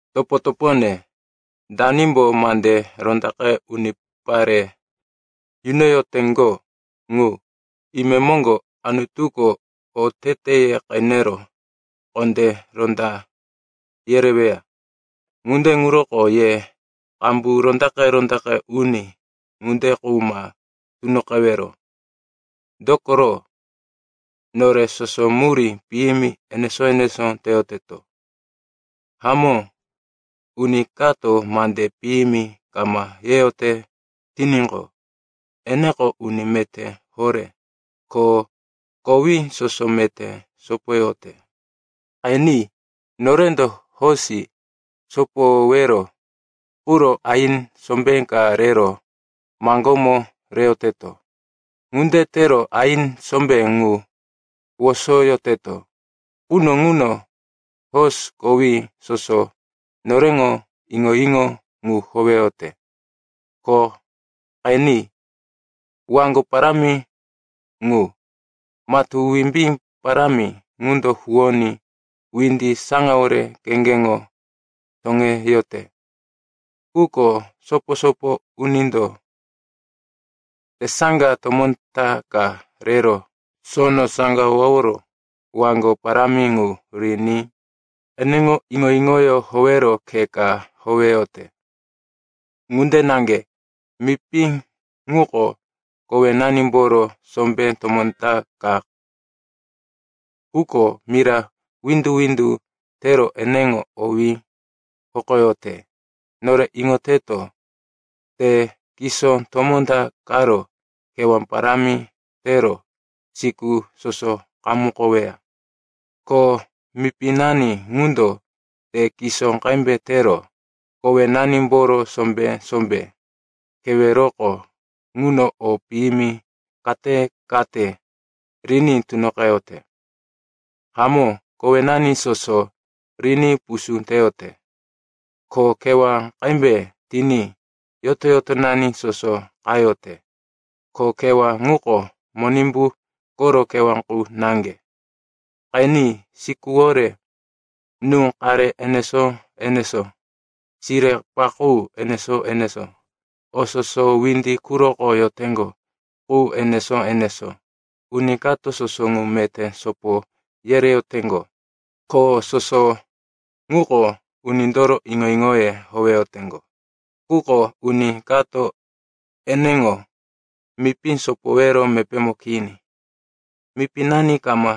Topo-topone, danimbo mande rondaqe unipare yunoyoteŋgo ŋu, imemoŋgo Anutuko oteteye qenero kondé ronda yereweya. Ŋunde ŋuroko ye qambu rondaqe-rondaqe uni ŋunde qu ma tunoqewero. Dokoro, nore soso murí piyimi enesó-enesó teyoteto. Hamó, uni kato mande piyimi kama yeyote tiníqo, eneko uni meté horé, ko kowí soso meté sopoyote. Qeni, norendo hosi sopoyowero quro aini sombé ka rero maŋgómo reyoteto. Ŋunde tero aini sombé ŋu wosoyoteto quno ŋuno hosi kowí soso noreŋo iŋo-iŋo qu howeyote. Ko qeni, waŋgo parámi ŋu, matú wimbí parámi ŋundo huwoní windi saŋawore kheŋgeŋo toŋeyote. Quko sopo-sopo unindo tesaŋga tomó ta ka rero sono saŋgaworo waŋgo parámi ŋu riní eneŋo iŋo-iŋoyó howero khe ka howeyote. Ŋunde naŋge, mipi ŋuko kowenanimboro sombé tomó ta ka, quko mira windu-windu tero eneŋo owí hokoyote. Nore iŋoteto, te kisó tomó ta qaro kewá parámi tero siku soso qamukoweya. Ko mipinani ŋundo te kisó qembe tero kowenanimboro sombé-sombé keweroko ŋuno o piyimi kate-kate riní tunoqeyote. Hamó, kowenani soso riní pusú teyote, ko kewá qembe tiní yoto-yotonani soso qayote, ko kewá ŋuko Monimbu koro kewá qu naŋge. Qeni, sikuwore nú-qare enesó-enesó, sire-paqú enesó-enesó, o soso windi quroko yoteŋgo qu enesó-enesó, uni kato soso ŋu meté sopo yereyoteŋgo, ko soso ŋuko unindoro iŋo-iŋoye howeyoteŋgo. Quko uni kato eneŋo mipí sopowero mepémo kini. Mipinani kama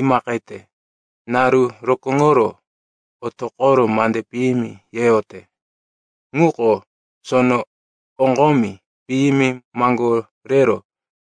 imaqete, naru rokóŋoro otoqoro mande piyimi yeyote. Ŋuko sono oŋgomi piyimi maŋgorero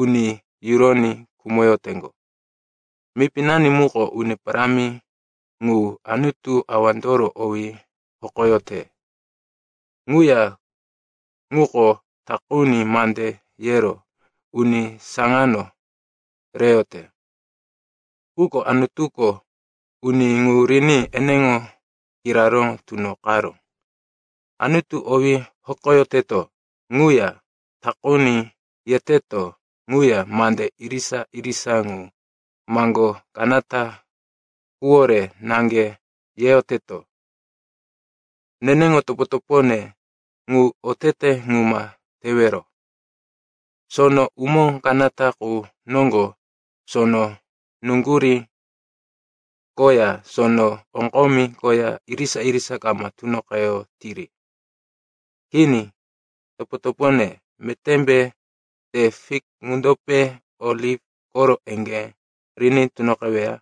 uni yuroní khumoyoteŋgo. Mipinani muko Uni Parámi ŋu, Anutu Awandoro owí hokoyote. Ŋuya ŋuko takuni mande yero uni saŋano reyote. Quko Anutuko uni ŋu riní eneŋo kiraró tunoqaró. Anutu owí hokoyoteto ŋuya takuni yeteto ŋuya, mande irisa-irisa ŋu maŋgó kanata quwore naŋge yeyoteto. Neneŋo topo-topone, ŋu otete ŋu ma tewero. Sono umó kanata qu noŋgo sono nuŋgurí koya sono oŋgomi koya irisa-irisa kama tunoqeyotiri. Kini. Topo-topone, metémbe te fik ŋundope oliv koro eŋgé riní tunoqeweya?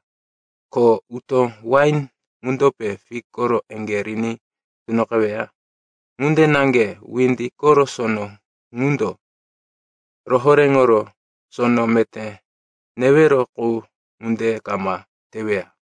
Ko utó wain ŋundope fik koro eŋgé riní tunoqeweya? Ŋunde naŋge windi koro sono ŋundo rohoréŋoro sono meté newero qu ŋunde kama teweya.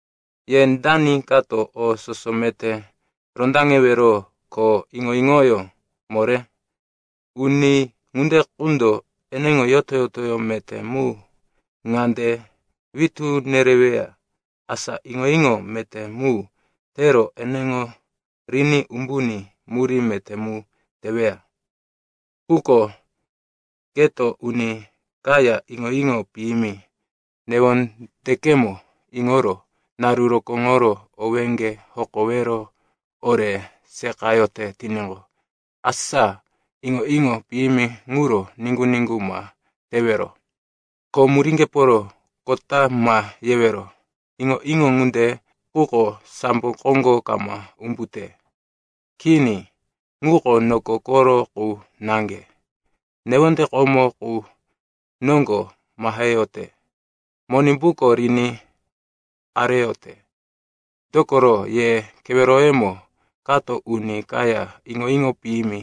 Ye dani kato o soso meté rondaŋewero ko iŋo-iŋoyó moré? Uni ŋunde qundo eneŋo yoto-yotoyó meté mu ŋande witú nereweya, asa iŋo-iŋo meté mu tero eneŋo riní umbuní murí meté mu teweya. Quko keto uni kaya iŋo-iŋo piyimi newondekemo iŋoro naru rokóŋoro owéŋge hokowero ore seqayote tiníqo, asa iŋo-iŋo piyimi ŋuro niŋgu-niŋgu ma tewero. Ko muríŋgeporo kota ma yewero. Iŋo-iŋo ŋunde quko sambo koŋgo kama umbute. Kini. Ŋuko noko koro qu naŋge, newonde komo qu noŋgo maheyote, Monimbuko riní areyote. Dokoro, ye keweroyemo kato uni kaya iŋo-iŋo piyimi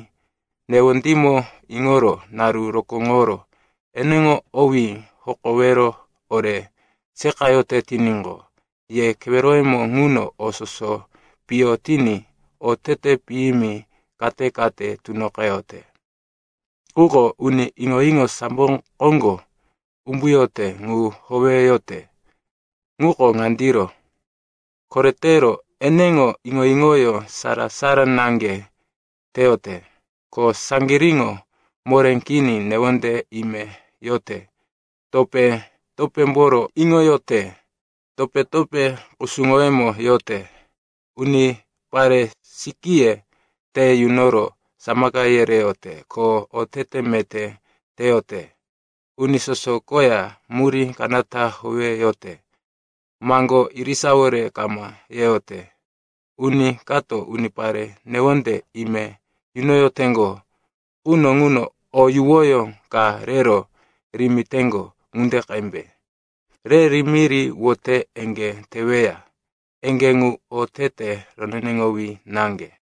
newondímo iŋoro naru rokóŋoro eneŋo owí hokowero ore seqayote tiníqo, ye keweroyemo ŋuno o soso piyo tiní otete piyimi kate-kate tunoqeyote. Quko uni iŋo-iŋo sambo koŋgo umbuyote qu howeyote ŋuko ŋandiro. Koretero, eneŋo iŋo-iŋoyó sara-sara naŋge teyote. Ko saŋgiríŋo moré kini newonde ime yote, topé-topémboro iŋoyote, topé-topé kusuŋoyemo yote, unipare sikíye te yunoro samaka yereyote ko otete meté teyote, uni soso koya murí kanata howeyote, maŋgó irisawore kama yeyote. Uni kato unipare newonde ime yunoyoteŋgo quno ŋuno o yuwoyó ka rero rimiteŋgo ŋunde qembe. Re rimiri wote eŋgé teweya. Eŋgé ŋu otete roneneŋowí naŋge.